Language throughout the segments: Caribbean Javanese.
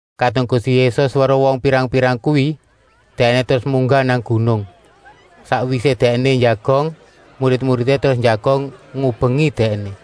Kadung Gusti Yésus weruh wong pirang-pirang kuwi, Dèkné terus munggah nang gunung. Sakwisé Dèkné njagong, murid-muridé terus njagong ngubengi Dèkné.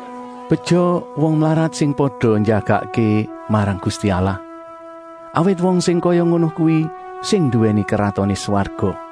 “Beja wong mlarat sing pada njagakké marang Gusti Allah, awit wong sing kaya ngono kuwi sing nduwèni Kratoné Swarga.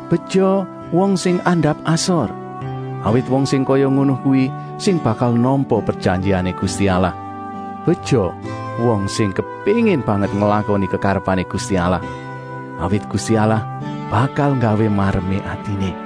Beja wong sing andap-asor, awit wong sing kaya ngono kuwi sing bakal nampa prejanjiané Gusti Allah. Beja wong sing kepéngin banget nglakoni kekarepané Gusti Allah, awit Gusti Allah bakal nggawé maremé atiné.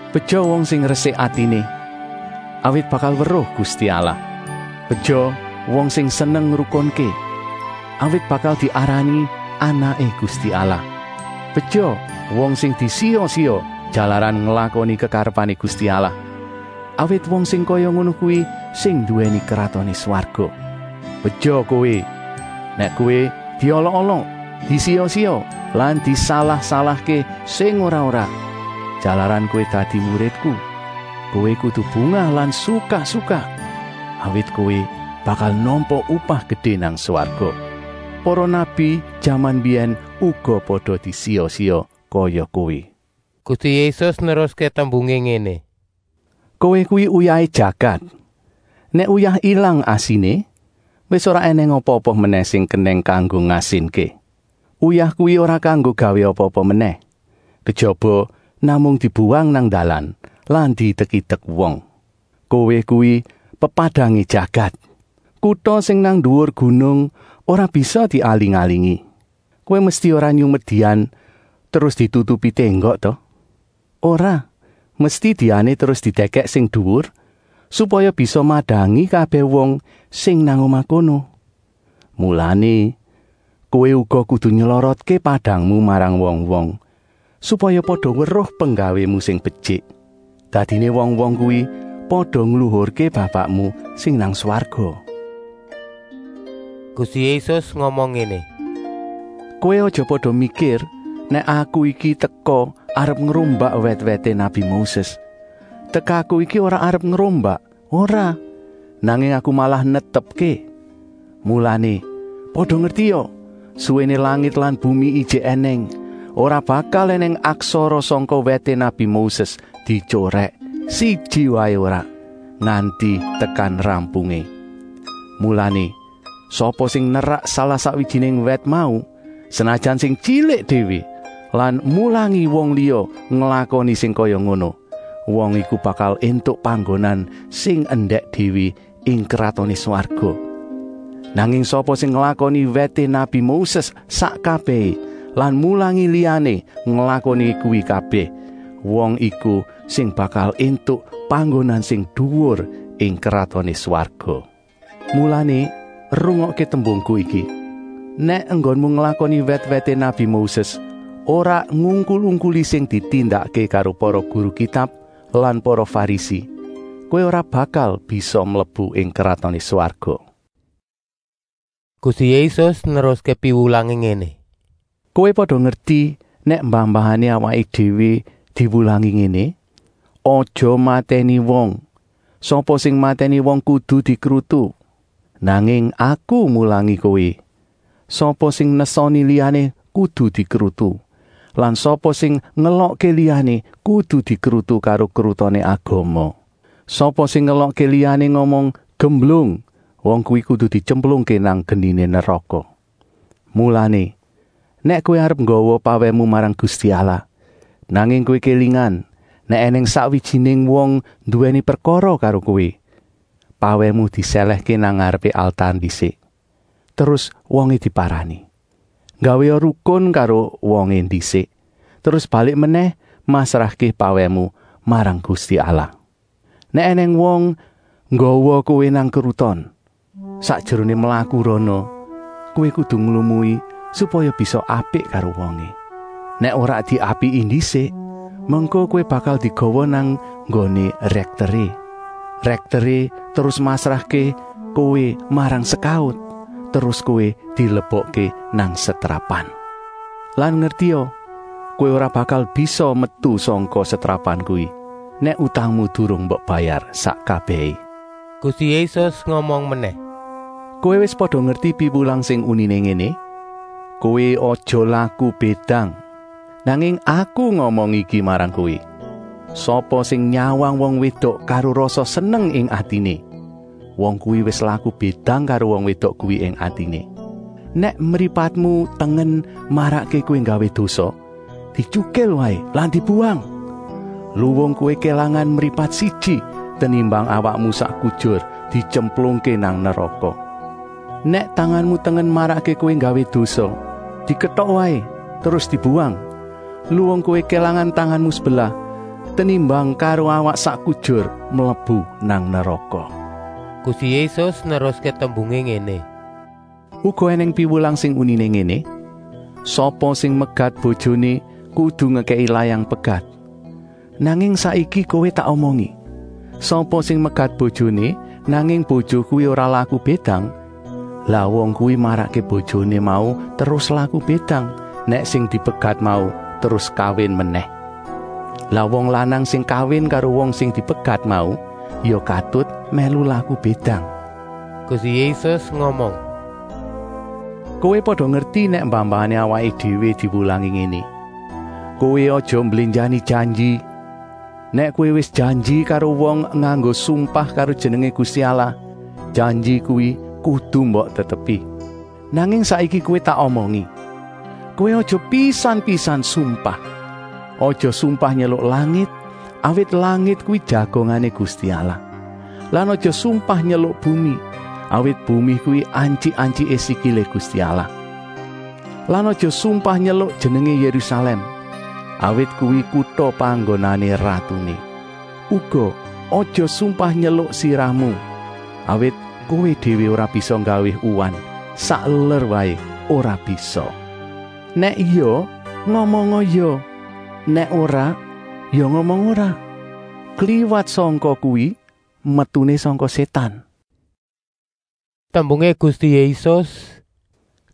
Beja wong sing resik atiné, awit bakal weruh Gusti Allah. Beja wong sing seneng ngrukunké, awit bakal diarani anaké Gusti Allah. Beja wong sing disiya-siya jalaran nglakoni kekarepané Gusti Allah, awit wong sing kaya ngono kuwi sing nduwèni Kratoné Swarga. “Beja kowé, nèk kowé diolok-olok, disiya-siya lan disalah-salahké sing ora-ora, jalaran kowé dadi muridku. Kowé kudu bungah lan sukak-sukak, awit kowé bakal nampa upah gedé nang swarga. Para nabi jaman mbiyèn uga pada disiya-siya kaya kowé.” Gusti Yésus neruské tembungé ngéné: “Kowé kuwi uyahé jagat. Nèk uyah ilang asiné, wis ora ènèng apa-apa menèh sing kenèng kanggo ngasinké. Uyah kuwi ora kanggo gawé apa-apa menèh, kejaba namung dibuwang nang dalan lan diidek-idek wong. “Kowé kuwi pepadangé jagat. Kuta sing nang nduwur gunung ora bisa dialing-alingi. Kowé mesti ora nyumet dian terus ditutupi ténggok ta? Ora, mesti diané terus didèkèk sing duwur, supaya bisa madangi kabèh wong sing nang omah kono. Mulané, kowé uga kudu nylorotké padangmu marang wong-wong, supaya pada weruh penggawému sing betyik. Dadiné wong-wong kuwi pada ngluhurké Bapakmu sing nang swarga.” Gusti Yésus ngomong ngéné: “Kowé aja pada mikir nèk Aku iki teka arep ngrombak wèt-wèté nabi Moses. Tekaku iki ora arep ngrombak, ora, nanging Aku malah netepké. Mulané, pada ngertia, suwéné langit lan bumi ijik ènèng, ora bakal ènèng aksara sangka wèté nabi Moses dityorèk, siji waé ora, nganti tekan rampungé. Mulané, sapa sing nerak salah-sakwijiné wèt mau, senajan sing tyilik déwé lan mulangi wong liya nglakoni sing kaya ngono, wong iku bakal éntuk panggonan sing endèk déwé ing Kratoné Swarga. Nanging sapa sing nglakoni wèté nabi Moses sak kabèhé lan mulangi liyané nglakoni kuwi kabèh, wong iku sing bakal éntuk panggonan sing duwur ing Kratoné Swarga. Mulané rungokké tembungku iki: ‘Nèk enggonmu nglakoni wèt-wèté nabi Moses ora ngungkul-ungkuli sing ditindakké karo para guru Kitab lan para Farisi, kowé ora bakal bisa mlebu ing Kratoné Swarga.’” Gusti Yésus neruské piwulangé ngéné: “Kowé pada ngerti nèk mbah-mbahané awaké déwé diwulangi ngéné: ‘Aja matèni wong; sapa sing matèni wong kudu dikrutu.’ Nanging Aku mulangi kowé: sapa sing nesoni liyané kudu dikrutu. Lan sapa sing ngelokké liyané kudu dikrutu karo krutoné Agama. Sapa sing ngelokké liyané ngomong ‘gemblung,’ wong kuwi kudu dityemplungké nang geniné neraka. Mulané, nèk kowé arep nggawa pawèhmu marang Gusti Allah, nanging kowé kélingan nèk ènèng sakwijiné wong nduwèni prekara karo kowé, pawèhmu disèlèhké nang ngarepé altar ndisik, terus wongé diparani. Nggawéa rukun karo wongé ndisik, terus balik menèh masrahké pawèhmu marang Gusti Allah. “Nèk ènèng wong nggawa kowé nang kruton, sakjeroné mlaku rana, kowé kudu nglumui, supaya bisa apik karo wongé. Nèk ora diapiki ndisik, mengko kowé bakal digawa nang nggoné rèkteré. Rèkteré terus masrahké kowé marang sekaut, terus kowé dilebokké nang setrapan. Lan ngertia, kowé ora bakal bisa metu sangka setrapan kuwi, nèk utangmu durung mbok bayar sak kabèhé.” Gusti Yésus ngomong menèh: “Kowé wis pada ngerti piwulang sing uniné ngéné: ‘Kowé aja laku bédang!’ Nanging aku ngomong iki marang kowé: sapa sing nyawang wong wédok karo rasa seneng ing atiné, wong kuwi wis laku bédang karo wong wédok kuwi ing atiné. Nèk mripatmu tengen marakké kowé nggawé dosa, dityukil waé lan dibuwang. Luwung kowé kélangan mripat siji, tenimbang awakmu sak kujur dityemplungké nang neraka. Nèk tanganmu tengen marakké kowé nggawé dosa, diketok waé terus dibuwang. Luwung kowé kélangan tanganmu sebelah, tenimbang karo awak sak kujur mlebu nang neraka.” Gusti Yésus neruské tembungé ngéné: “Uga ènèng piwulang sing uniné ngéné: ‘Sapa sing megat bojoné kudu ngekèki layang pegat.’ Nanging saiki kowé tak omongi: sapa sing megat bojoné, nanging bojo kuwi ora laku bédang, lah wong kuwi marakké bojoné mau terus laku bédang, nèk sing dipegat mau terus kawin menèh. Lah wong lanang sing kawin karo wong sing dipegat mau ya katut mèlu laku bédang.” Gusti Yésus ngomong: “Kowé pada ngerti nèk mbah-mbahané awaké déwé diwulangi ngéné: ‘Kowé aja mblénjani janji. Nèk kowé wis janji karo wong nganggo sumpah karo jenengé Gusti Allah, janji kuwi kudu mbok tetepi.’ Nanging saiki kowé tak omongi: kowé aja pisan-pisan sumpah. Aja sumpah nyeluk langit, awit langit kuwi jagongané Gusti Allah. Lan aja sumpah nyeluk bumi, awit bumi kuwi antyik-antyiké sikilé Gusti Allah. Lan aja sumpah nyeluk jenengé Yérusalèm, awit kuwi kuta panggonané ratuné. Uga aja sumpah nyeluk sirahmu, awit kowé déwé ora bisa nggawé uwan, sakeler waé ora bisa. Nèk ya, ngomonga ya, nèk ora, ya ngomong ora. Kliwat sangka kuwi metuné sangka Sétan.” Tembungé Gusti Yésus: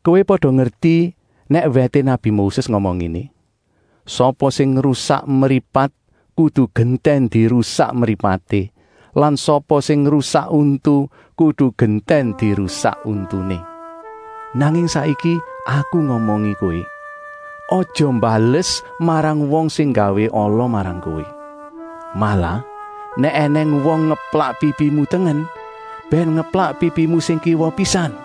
“Kowé pada ngerti nèk wèté nabi Moses ngomong ngéné: ‘Sapa sing ngrusak mripat kudu gentèn dirusak mripaté lan sapa sing ngrusak untu kudu gentèn dirusak untuné.’ Nanging saiki Aku ngomongi kowé: aja mbales marang wong sing nggawé ala marang kowé. Malah nèk ènèng wong ngeplak pipimu tengen, bèn ngeplak pipimu sing kiwa pisan.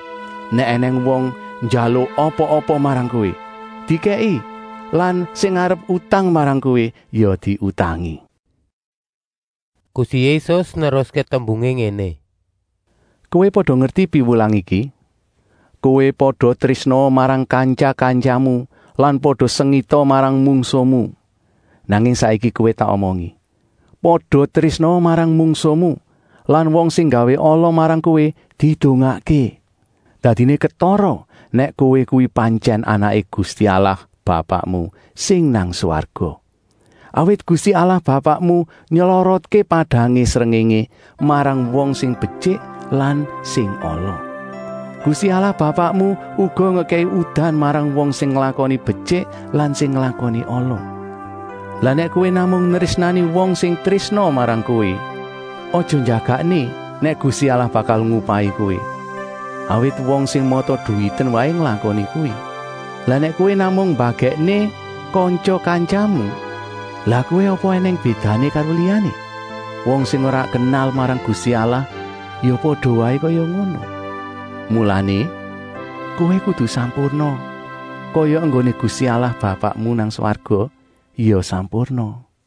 Nèk ènèng wong njaluk apa-apa marang kowé, dikèki lan sing arep utang marang kowé ya diutangi.” Gusti Yésus neruské tembungé ngéné: “Kowé pada ngerti piwulang iki: ‘Kowé pada trésnaa marang kantya-kantyamu lan pada sengita marang mungsuhmu.’ Nanging saiki kowé tak omongi: pada trésnaa marang mungsuhmu lan wong sing nggawé ala marang kowé didongakké. Dadiné ketara nèk kowé kuwi pantyèn anaké Gusti Allah Bapakmu sing nang swarga. Awit Gusti Allah Bapakmu nylorotké padangé srengéngé marang wong sing betyik lan sing ala. Gusti Allah Bapakmu uga ngekèki udan marang wong sing nglakoni betyik lan sing nglakoni ala. Lah nèk kowé namung nrésnani wong sing trésna marang kowé, aja njagakké nèk Gusti Allah bakal ngupahi kowé, awit wong sing mata-duwiten waé nglakoni kuwi. Lah nèk kowé namung mbagèkké kantya-kantyamu, lah kowé apa ènèng bédané karo liyané? Wong sing ora kenal marang Gusti Allah ya pada waé kaya ngono. Mulané, kowé kudu sampurna, kaya enggoné Gusti Allah Bapakmu nang swarga ya sampurna.”